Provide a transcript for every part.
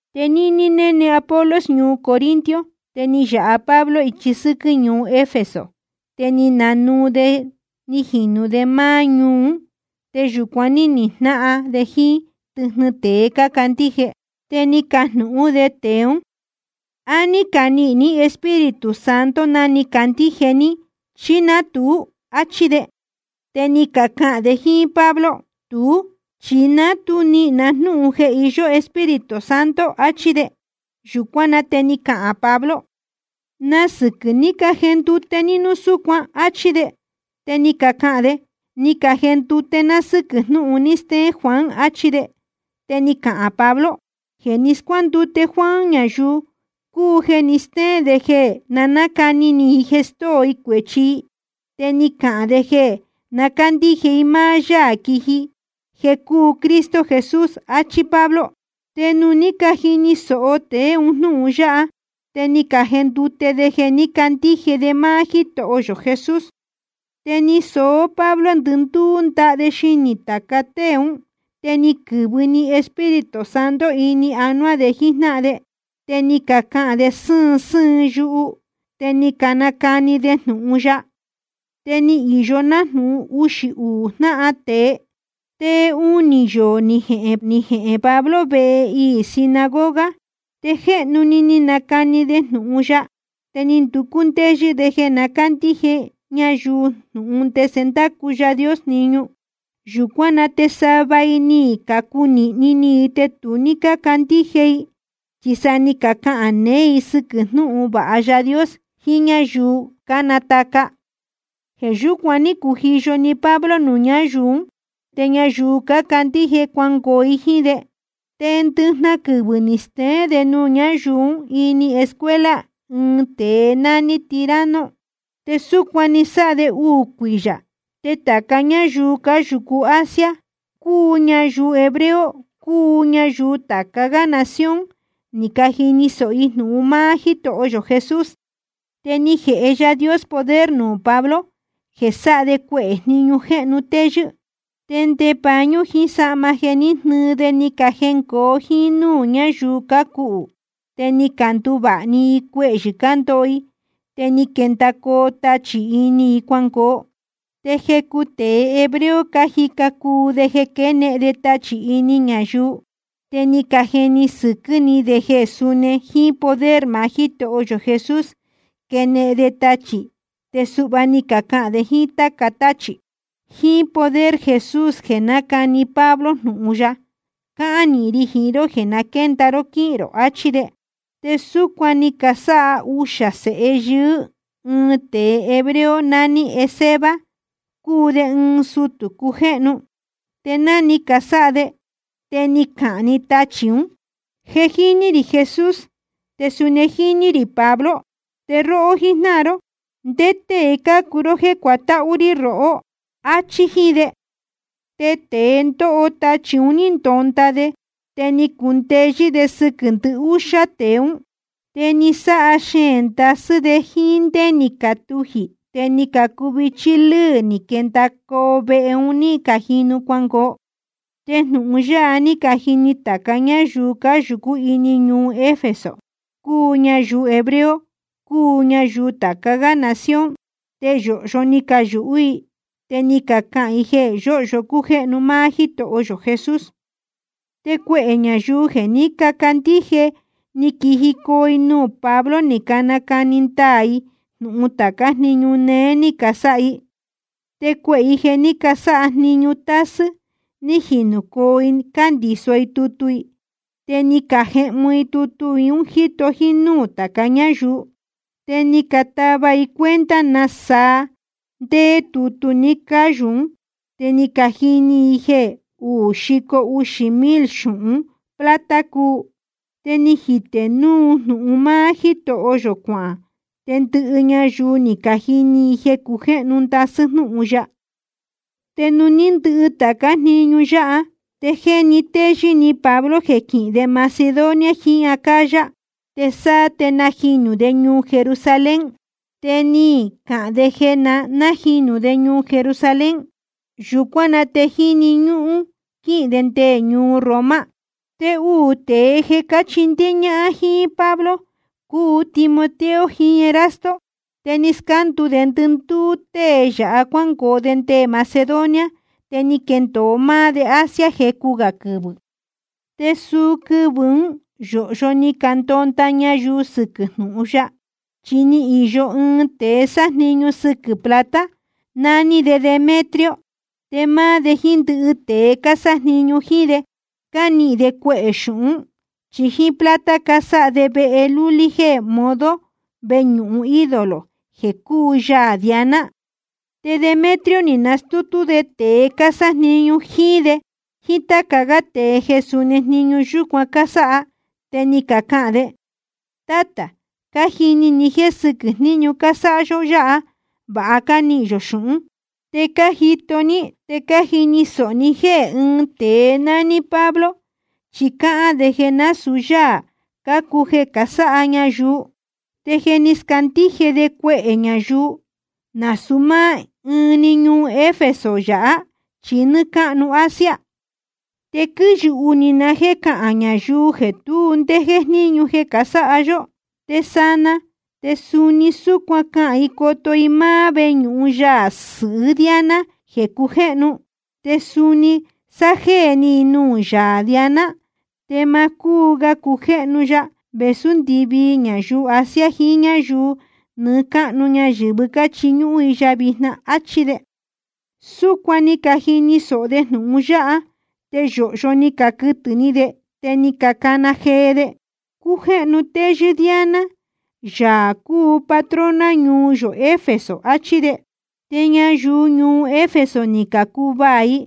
Te níní néne Apolos ñuu Corinto, te ni yāha Pablo ichi sɨ́quɨ́ ñuu Efeso, te ni nanuu de ni jinū de máá ñuu ún. Te yūcuan ní nijnáhan de jíín tɨjnɨ tēe cácandíje. Te ni cajnūhún de tēe ún: ¿A ní canihīn ní Espíritu Santo ná ni cacandíje ní, chí ná tuú? áchí de. Te ni cacahān de jíín Pablo: Tuú, chi ni ná tu nihīn na jnúhun jeē iyó Espíritu Santo, achí de. Yūcuán na te ni cahān Pablo: ¿Na sɨquɨ̄ ni cajendute ní núu súcuan? áchí de. Te ni cacahān de: Ni cajendute ná sɨ́quɨ̄ jnúhun ni steén Juan, achí de. Te ni cahān Pablo: Jeē ní scuándute Juan ñayuu cúu jeē ni stéén de jeē na nácani ni i jeē stóo i cuēchi i, te ni cahān de jeē na cándíje i máá Yáā quiji jeē cúu Cristo Jesús, áchí Pablo. Te nuū ní cajini sōho tēe un jnúhun yáha, te ni cajendute de jeē ní cacandíje de máá Jítoho yō Jesús. Te ni soó Pablo ndɨndúú ndaha de xinī tāca tée ún, te ni quɨ̄vɨ ni Espíritu Santo ini anuá de jíjnáhan de, te ni cacahān de sɨ́ɨn sɨ́ɨn yuhu te ni canacani de jnūhun ya. Te ni īyo nájnūhun uxī uū jnahán tēe. Te unī yoō ni jehēn jehēn Pablo vehe iī sinagoga. Te jéhnu ni nacani de jnūhun ya, te ni nducú ndéyɨ́ de jeē na cándíje ñayuu jnūhun ndese ndácu Yaā Dios jniñu. Yūcuán na te sava i ni cacunīhni ni i te tu ní cácandíje i, chi sa ni cacahān neé i sɨquɨ̄ jnúhun vāha Yaā Dios jiín ñáyuu cánataca. Jeē yúcuan ní cujiyo‑ni Pablo nuū ñáyuu ún, te ñayuu cácandíje cuangoo i jíín de. Te ndɨjnahan quɨvɨ̄ ni steén de nuū ñáyuu ún ini escuela ɨɨn tēe nání Tiranno. Te súcuan ni sáha de uū cuiyā, te tāca ñáyuu cáyūcu Asia, cúu ñayuu hebreo cúu ñayuu tāca gá nación, ni cajini sōho i jnūhun máá Jítoho yō Jesús. Te ni jēhe Yaā Dios poder nuū Pablo jeē sáha de cuehē jniñu jéhnu téyɨ́. Te nde pañú jiín sahma jeē ní jnɨɨ de ni cajengoo jíín núū ñáyuu cácuhū, te ni canduvāha‑ni i cuehyɨ̄ cándoho i, te ni quendacoo tachī ini i cuangoo. Te jecu tēe hebreo cájica cuu de jeē quénehen de tachī ini ñayuu, te ni cajeni sɨquɨ́ ni de jeē suni jíín poder maá Jítoho yō Jesús quenehen de tachī, te suhva ni cacahān de jíín táca táchī: Jíín poder Jesús jeē nácani Pablo jnūhun ya, cáhán nīhin ri jiín ró jeē na quénda ró quíhīn rō, achí de. Te súcuan ni casáha uxā sēhe yɨɨ́ ɨɨn tēe hebreo nání Esceva, cúu de ɨɨn sutū cujéhnu. Te ná ni casáha de, te ni cahān‑ni tachī ún: Je jíní rī Jesús, te suni jíní rī Pablo. Te róhó jíjnáhan ró ¿ndé tée cácuu ró jéē cuatáhú rí rohó? áchí jíín de. Te tēe ndóho tachī un ní ndonda de, te ni cundeyɨ́ de sɨquɨ̄ ndɨhúxá tēe ún. Te ni sáha xeēn ndasɨ́ de jíín ndé ni catujī te ni cacuvichí lɨ́ɨ ni quendacoo vehe un ní cajinu cuangoo. Te jnūhun yáha ní cajini tāca ñáyuu cáyūcú ini ñuu Efeso, cúu ñayuu hebreo cúu ñayuu tāca gá nación, te yōhyo ni cayūhú i, te ni cacahān i jeē yóhyo cújéhnu máá Jítoho yō Jesús. Te cuehē ñayuu jeē ní cacandíje ni quijicoo i nuū Pablo ni nacani ndaā i jnūhun tācá jniñu neé ní casáha i. Te cuehē i jeē ní casáha jniñu tásɨ́ ní jinūcoo i cándīso i tutu i, te ni cajehmu i tutu un jíto nuū tāca ñáyuu. Te ni catava i cuenta nasaa ndéé tutu ni cáyū ún, te ni cajini i jeē uú xico uxī mil xūhun plata cúu. Te ni jitē jnūhun máá Jítoho yō cuahān, te ndɨhɨ ñayuu ni cajini i jeē cujéhnu ndasɨ́ jnúhun ya. Te nuū ní ndɨhɨ tācá jniñu yáha, te jéni téyɨ́ ni Pablo jeē quihīn de Macedonia jiín Acaya, te sáá te najinū de ñuu Jerusalén. Te ni cahān de jeē na nájinū de ñuu Jerusalén, yūcuán na te jíni ñúhún quíhīn de nde ñuu Roma. Te uū tēe jeē cáchindéé ñáhán jíín Pablo cúu Timoteo jiín Erasto, te ni scándu de ndɨndúú tée yāhá cuángoo de nde Macedonia, te ni quendōo máá de Asia jecu gā quɨvɨ̄. Te suu quɨvɨ̄ ún yōhyo ni candonda ñayuu sɨquɨ̄ jnúhun ya. Chi ni īyo ɨɨn tēe sájniñu sɨquɨ̄ plata, nání de Demetrio. Te máá de jíín ndɨhɨ tēe cásájniñu jíín de, cánihīn de cuehē xūhún, chi jíín plata casáha de vehe lulí jéē modo veñūhun ídolo i jeē cúu yaā Diana. Te Demetrio ni nastútú de tēe cásájniñu jíín de jíín táca gá tēe jeē suni jniñu yúcuan cásáha, te ni cahān de: Tátā, cájini ni jéē sɨquɨ́ jniñu cásáha yó yáha vāha cánihīn yō xūhún. Te cájito ní te cájini sōho ní jéē ɨɨn tēe nání Pablo chi cáhán de jeē násūu yáā cácuu jeē casáha ñayuu. Te je ni scandíje de cuehē ñayuu, nasūu máá ɨɨn‑ni ñuu Efeso yāhá chi nɨ́ɨ́ cáhnu Asia. Te quíyūhú ni na jéē cahān ñayuu jeē tu ndé jéjníñu jeē casáha yó. Te sanaa te suni súcuan cahān i coto i máá veñūhun yaā sɨhɨ́ Diana jeē cujéhnu, te suni sájéē ni i nuū yaā Diana, te ma cúu ga cujéhnu ya vēsú ndɨvii ñayuu Asia jiín ñáyuu nɨɨ́ cáhnu ñayɨ̄vɨ́ cáchiñúhún i ya vijna, áchí de. Súcuan ni cajini sōho de jnūhun yáha te yōhyo ni caquɨtɨ̄ ni de, te ni cacana jee de: Cújéhnu téyɨ́ Diana, yaā cúu patrona ñuu yō Efeso, achí de. Te ñayuu ñuu Efeso ni cacuvaā i,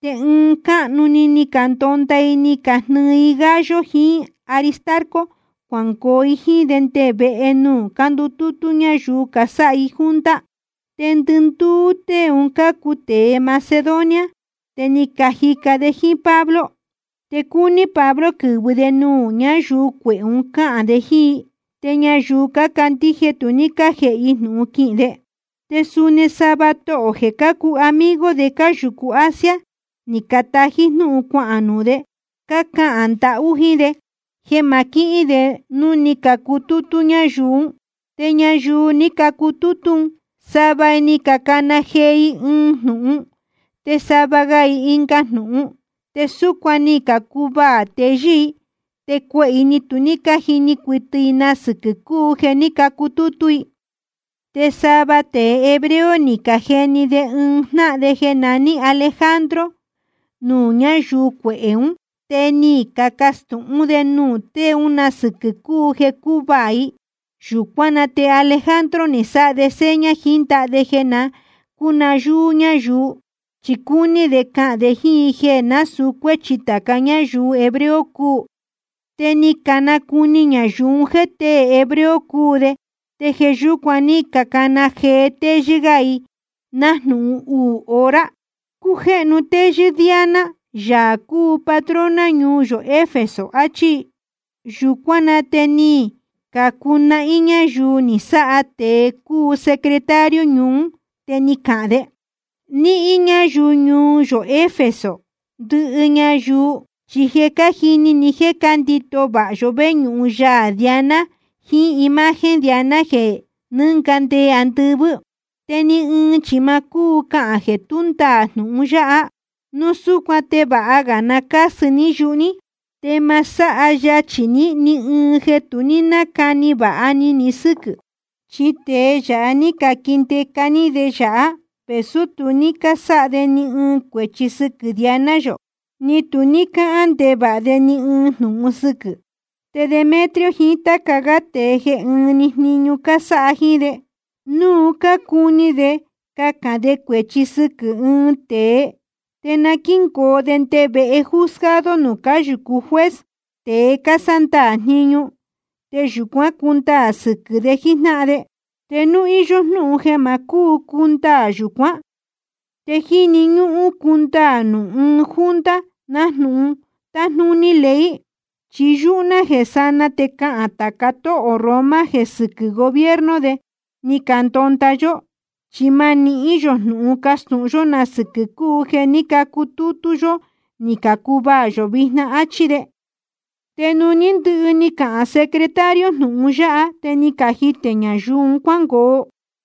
te ɨɨn cáhnu‑ni ni candonda i ni cajnɨɨ i Gayo jiín Aristarco cuangoo i jíín de nde vehe nuū cándutútú ñáyuu casáha i junta. Te ndɨndúú tée un cácuu tēe Macedonia, te cájica de jíín Pablo. Te cúní Pablo quɨ̄vɨ de nuū ñáyuu cuehē un cáhān de jíín i, te ñayuu cácandíje tu ní cájēhe i jnūhun quihīn de. Te suni sava tohō jeē cácuu amigo de cáyūcu Asia, ni catají jnúhun cuahān nuū de, cácahān ndahú jíín de jeē ma quihín de nuū ní cacutútú ñáyuu ún. Te ñayuu ní cacutútú un, sava i ni cacana jee i ɨɨn jnūhun te sava ga i ɨnga jnūhun, te súcuan ni cacuvaā teyɨ́ i, te cuehē i ni tu cájini cuɨtɨ i na sɨquɨ̄ cúu jeē ní cacutútú i. Te sava tēe hebreo ni cajeni de ɨɨn jnáhan de jeē naní Alejandro nuū ñáyuu cuehē ún, te ni cacastūhún de nuū tée ún na sɨquɨ̄ cúu jeē cácuvaā i. Yūcuán na te Alejandro ni sáha de seña jiín ndaha de jeē na cúnayúú ñáyuu, chi cúní de cahān de jíín i jeē násūu cuéchi tāca ñáyuu hebreo cúu. Te ni canacuni ñayuu un jéē tée hebreo cúu de, te jeē yúcuan ní cacana jee téyɨ́ gá i nájnūhun uū hora: Cújéhnu téyɨ́ Diana, yaā cúu patrona ñuu yō Efeso, achí i. Yūcuán na te ni cacunahín ñáyuu ni sáha tēe cúu secretario ñuu ún, te ni cahān de: Níhín ñáyuu ñuu yō Efeso, ndɨhɨ ñayuu chi je cájini i jeē cándīto vāha yó veñūhun yaā Diana jiín imagen Diana jeē ní nɨnga nde andɨvɨ́. Te ni ɨɨn chi ma cúu cahān jeē tú ndaā jnūhun yáha. Núu súcuan te vāha ga na cásɨ ní yuhu ní, te ma sáha yachī ní ɨɨn jeē tu ní nácani vāha ni ni sɨ́quɨ̄. Chi tēe yáha ní caquindeca ní de yāhá vēsú tu ní cásáha de ni ɨɨn cuēchi sɨquɨ̄ Diana yō, ni tu ní cácahān ndevāha de ni ɨɨn jnūhun sɨquɨ̄. Te Demetrio jiín táca gá tēe jeē ɨ́ɨn‑ni jniñu cásáha jíín de, núu cácuni de cahān de cuēchi sɨquɨ̄ ɨɨn tēe, te na quíngoo de nde vehe juzgado nuū cáyūcu juez, tēe cásándaā jniñu, te yūcuán cundaā sɨquɨ̄ de jíjnáhan de. Te núu íyó jnúhun jeē ma cúu cundaā yūcuán, te jíni ñúhún cundaā nuū ɨɨn junta nájnūhun tájnúní ley. Chi yúhú ná jeē sanaa te cahān tāca tóhō Roma jeē sɨquɨ́ gobierno de ni candonda yó, chi ma nihín yō jnūhun castūhun yó na sɨquɨ̄ cúu jeē ní cacutútú yó ni cacuvaā yō vijna, áchí de. Te nuū ní ndɨhɨ ni cahān secretario jnūhun yáha, te ni cajitē ñayuu un cuángoo.